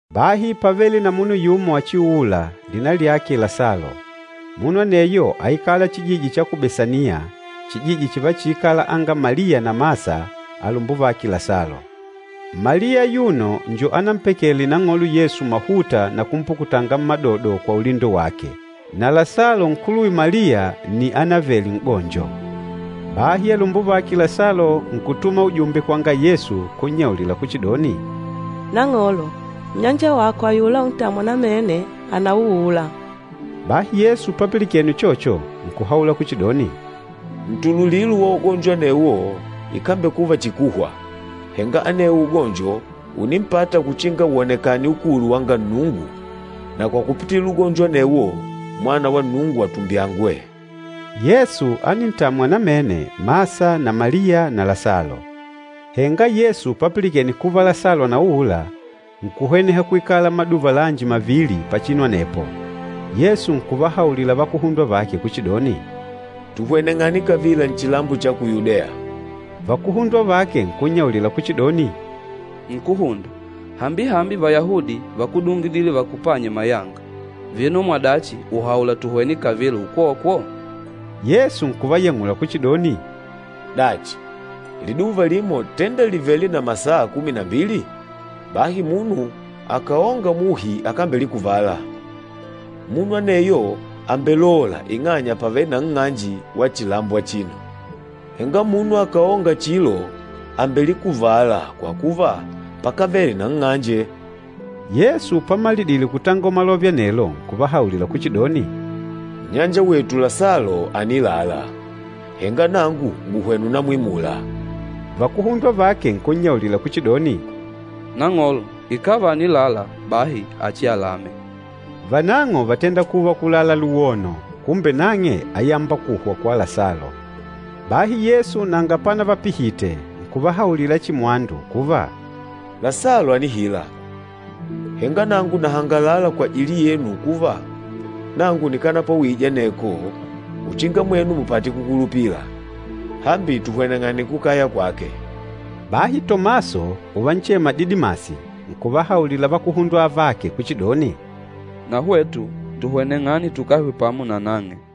Bahi pávele na munu yumo achiuûla, lina lyake Lasalo. Munu aneyo áikala chijiji cha ku Besaniya, chijiji chivachiikala anga Maliya na Masa alumbuvake Lasalo. Maliya ayuno njo anampakele Nang'olo Yesu mahuta na kumpukutanga mmadodo kwa ulindo wake. Na Lasalo nkuluwe Maliya nni ánavele n'gonjo. Bahi alumbuvake Lasalo nkutuma ujumbe kwanga Yesu kunnyaulila kuchidoni, “Nang'olo, nnyanja wako ayula untamwa namene, ànauula!” Bahi Yesu papilikene uchocho, nkuhaula kuchidoni, “Ntululilo wa ugonjo anewo ikambekuva chihi kuhwa, henga anewo ugonjo ùnimpata uchinga wonekane ukulu wanga Nnungu na kwa kupitila ugonjo anewo, Mwana wa Nnungu atumbyangwe.” Yesu ánintamwa namene Masa na Maliya na Lasalo. Henga Yesu papilikene kuva Lasalo ànauula, nkuhweneha kwikala maduva lanji mavili pachinu anepo. Yesu nkuvahaulila vakuhundwa vake kuchidoni, “Tuhweneng'ane kavila chilambo cha ku Yudeya!” Vakuhundwa vake nkunnyaulila kuchidoni, “Nkúhunda, hambihambi Vayahudi vákudungidile vakupanye mayanga, vino mwadachi ùhaula tuhwene kavila ukwokwo?” Yesu nkuvayang'ula kuchidoni, “Dachi, liduva limo tenda lìvele na masaa kumi na mbili? Bahi munu akàonga muhi akambelikuvala. Munu aneyo àmbelola ing'anya pàvele na nng'anje wa chilambo achino. Henga munu akàonga chilo àmbelikuvala kwa kuva pakávele na nng'anje.” Yesu pamalidile kutangola malove anelo, nkuvahaulila kuchidoni, “Nnyanja wetu Lasalo ànilala, henga nangu ngùhwena ùnamwimula.” Vakuhundwa vake nkunnyaulila kuchidoni, “Nang'olo, ikàva ànilala, bahi achialame” Vanang'o vátenda kuva kulala luwono, kumbe nang'e áyamba kuhwa kwa Lasalo. Bahi Yesu nanga panavapihite, nkuvahaulila chihi mwandu kuva, “Lasalo ànihila, henga nangu nahangalala kwajili yenu kuva, nangu nikanapwawije aneko, uchinga mwenu mupate kukulupila. Hambi tuhweneng'ane kukaya kwake.” Bahi Tomaso, uvanchema Didimasi, nkuvahaulila vakuhundwa avake kuchidoni, “Na hwetu tuhweneng'ane tukahwe pamo na nang'e!”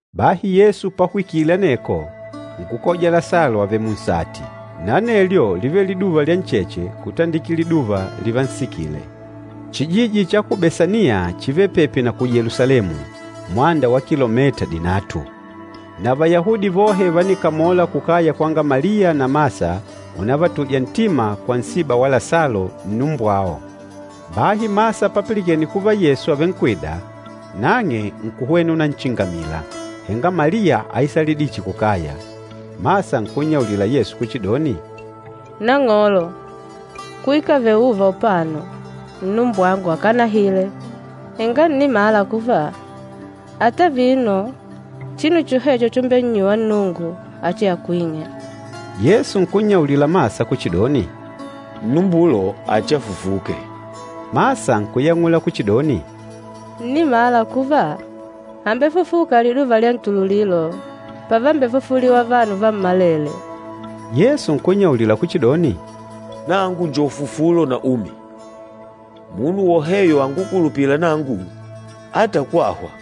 Bahi Yesu pahwikile aneko, nkukoja Lasalo avèlè munsati, na anelyo lívele liduva lya ncheche kutandikila liduva livansikile. Chijiji cha ku Besaniya chívele pepi na ku Yelusalemu, mwanda wa kilomita dinatu. Na Vayahudi vohe vánikamola kukaya kwanga Maliya na Masa unavatuja ntima kwa nsiba wa Lasalo, nnumbwao. Bahi Masa papilikene kuva Yesu àvenkwida, nang'e nkuhwena unachingamila, henga Maliya áisalidile chihi kukaya. Masa nkunnyaulila Yesu kuchidoni, “Nang'olo, kwikavele ùùva upano, nnumbwangu akanahile. Henga ǹnimala kuva, ata vino chinu chohecho chumbennyuwa Nnungu, achiakwing'e.” Yesu nkunnyaulila Masa kuchidoni, “Nnumbulo achiafufuke.” Masa nkuyang'ula kuchidoni, “Ǹnimala kuva, àmbefufuka liduva lya ntululilo, pavambefufuliwa vanu vammalele.” Yesu nkunnyaulila kuchidoni, “Nangu njo ufufulo na umi. Munu woheyo angukulupîla nangu, àmbekuva mumi ata kwahwa.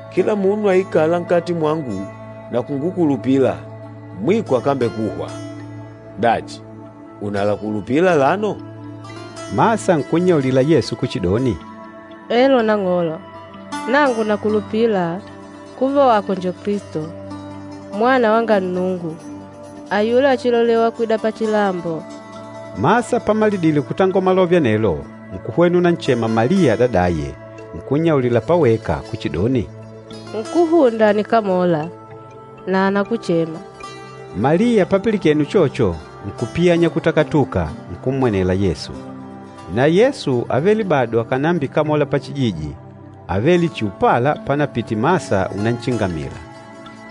Kila munu aikâla nkati mwangu na kungukulupila, mwiko akambekuhwa. Dachi, ùnalakulupila alano?” Masa nkunnyaulila Yesu kuchidoni, “Elo Nang'olo, nangu nakulupila kuva wako njo Kilisto, Mwana wanga Nnungu, ayula achilolewa kwida pachilambo.” Masa pamalidile kutangola malove anelo, nkuhwena unanchema Maliya adadaye, nkunnyaulila paweka kuchidoni, “Nkúhunda ànikamola, na anakuchema.” Maliya papilikene uchocho, nkupiyanya kutakatuka, nkummwenela Yesu. Na Yesu ávele bado akànambikamola pachijiji, ávele chihi upala panapite Masa unachingamila.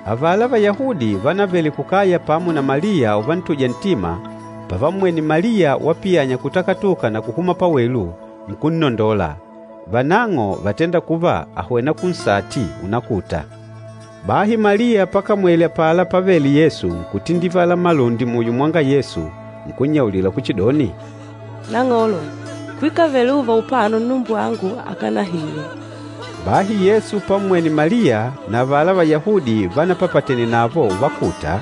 Avala Vayahudi vánavele kukaya pamo na Maliya uvantuja ntima, pavammwene Maliya wapiyanya kutakatuka na kuhuma pawelu, nkunnondola. Vanang'o vátenda kuva àhwena kunsati unakuta. Bahi Maliya pakamwele apala pávèlè Yesu, nkutindivala malundi muyo mwanga Yesu, nkunnyaulila kuchidoni, “Nang'olo, kwikavele uuva upano nnumbwangu akanahile!” Bahi Yesu pammwene Maliya na avala Vayahudi vánapapatene navo uvakuta,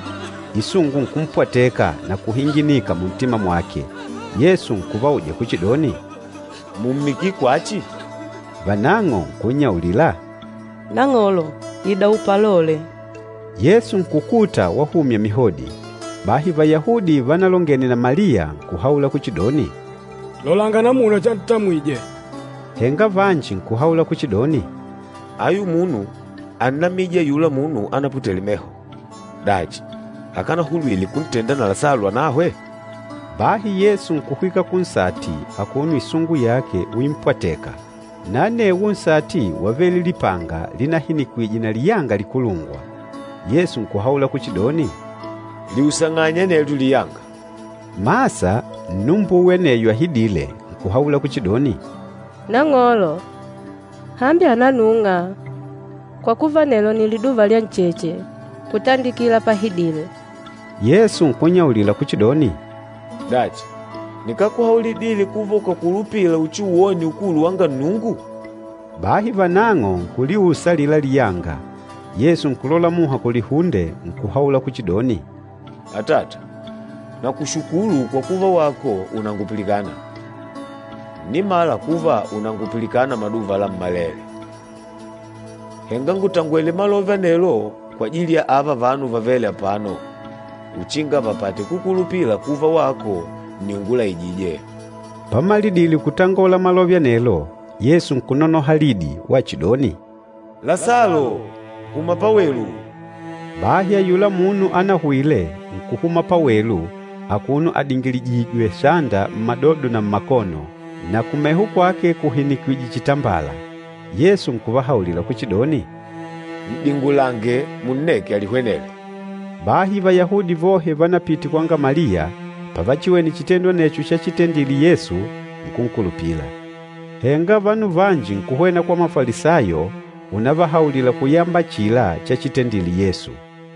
isungu nkumpwateka na kuhinginika muntima mwake. Yesu nkuvauja kuchidoni, “Mùmmikile kwachi?” Vanang'o nkunnyaulila, “Nang'olo, ida upalole.” Yesu nkukuta wahumya mihodi. Bahi Vayahudi vánalongene na Maliya nkuhaula kuchidoni, “Lolanga namuna chantamwije!” Henga vanji nkuhaula kuchidoni, “Ayu munu ánnamije ayula munu anaputele meho. Dachi, akanahulwile kuntenda na Lasalo anahwe?” Bahi Yesu nkuhwika kunsati akuno isungu yake uimpwatèkà. Na anewo nsati wávele lipanga, linahinikwije na liyanga likulungwa. Yesu nkuhaula kuchidoni, “Liusang'anye anelyo liyanga!” Masa, nnumbuwe aneyo ahidîle, nkuhaula kuchidoni, “Nang'olo, hambi ànanung'a, kwa kuva nelo nni liduva lyancheche kutandikila pahidile!” Yesu nkunnyaulila kuchidoni, “Dachi, nikákuhaulidile kuva ukàkulupila uchiuwone ukulu wanga Nnungu?” Bahi vanang'o nkuliusa alila liyanga. Yesu nkulola muha kulihunde, nkuhaula kuchidoni, “Atata, nakushukulu kwa kuva wako ùnangupilikana. Ǹnimala kuva ùnangupilikana maduva lammalele. Henga ngùtangwele malove anelo kwajili ya ààva vanu vavêle apano, uchinga vapate kukulupila kuva wako nni ungulaijîje.” Pamalidile kutangola malove anelo, Yesu nkunonoha lidi wachidoni, “Lasalo, huma pawelu!” Bahi ayula munu anahwile, nkuhuma pawelu, akuno adingilijìjwè sanda mmadodo na mmakono, na kumeho kwake kuhinikwije chitambala. Yesu nkuvahaulila kuchidoni, “N'dingulange, munneke alihwenele.” Bahi Vayahudi vohe vánapite kwanga Maliya, pavachiwene chitendo anecho chatendile Yesu, nkunkulupila. Henga vanu vanji nkuhwena kwa Mafalisayo unavahaulila kuyamba achila chachitendile Yesu.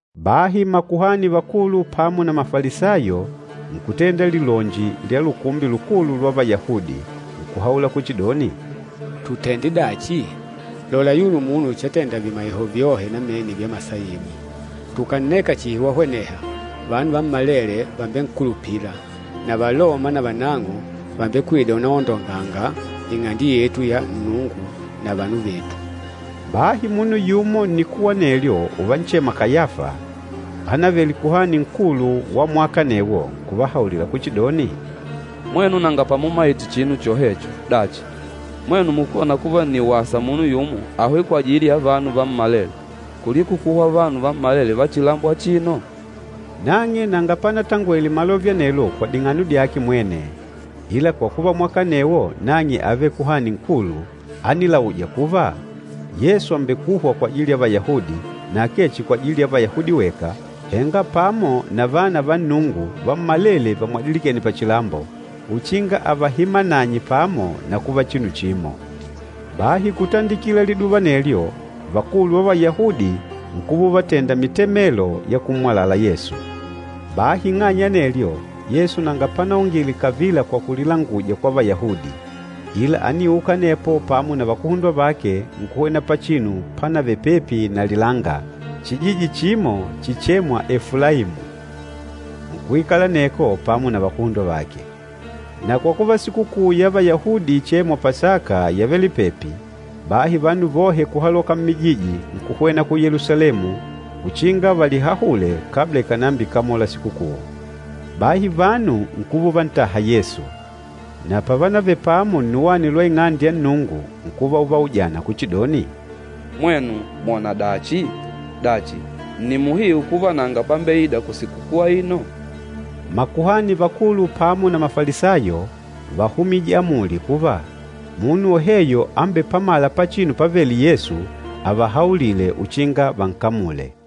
Bahi makuhani vakulu pamo na Mafalisayo nkutenda lilonji lya Lukumbi Lukulu lwa Vayahudi, nkuhaula kuchidoni, “Tutende dachi? Lola ayuno munu chatenda vimaiho vyohe namene vya masaibu. Tukànneka chihi wahweneha, vanu vammalele vàmbenkulupila, na Valoma navanang'o vàmbekwida unaondonganga Ing'ande yetu ya Nnungu na vanu vetu!” Bahi munu yumo nnikuwa anelyo uvanchema Kayafa, ánavele Kuhani Nkulu wa mwaka anecho, nkuvahaulila kuchidoni, “Mwenu nanga pamumaite chinu chohecho! Dachi, mwenu mukóna kuva nni wasa munu yumo ahwe kwajili ya vanu vammalele, kuliko kuhwa vanu vammalele va chilambo achino?” Nang'e nanga panatangwele malove anelo kwa ding'ano dyake mwene, ila kwa kuva mwaka anewo nang'e ávele Kuhani Nkulu, ánilauja kuva, Yesu àmbekuhwa kwajili ya Vayahudi, na akee chihi kwajili ya Vayahudi weka, henga pamo na vana va Nnungu vammalele vamwadilikêne pachilambo, uchinga avahimananye pamo na kuva chinu chimo. Bahi kutandikila liduva anelyo, vakulu va Vayahudi nkuva uvatenda mitemelo ya kummwalala Yesu. Bahi ing'anya ya anelyo, Yesu nanga panaongile kavila kwa kulilanguja kwa Vayahudi, ila ániuka anepo pamo na vakuhundwa vake nkuhwena pachinu pánavele pepi na lilanga, chijiji chimo chichêmwa Efulaimu. Nkuikala aneko pamo na vakuhundwa vake. Na kwa kuva Sikukuu ya Vayahudi ichêmwa Pasaka yávele pepi, bahi vanu vohe kuhaloka mmijiji, nkuhwena ku Yelusalemu uchinga valihahule, kabla ikànambikamola sikukuu. Bahi vanu nkuva uvantaha Yesu. Na pávanavele pamo nnuwani lwa Ing'ande ya Nnungu, nkuva uvaujana kuchidoni, “Mwenu mwòna dachi? Dachi, nni muhiu kuva nanga pambeida kusikukuu aino?” Makuhani vakulu pamo na Mafalisayo váhumije amuli kuva, munu woheyo ambepamâla pachinu pavêle Yesu, avahaulile uchinga vankamule.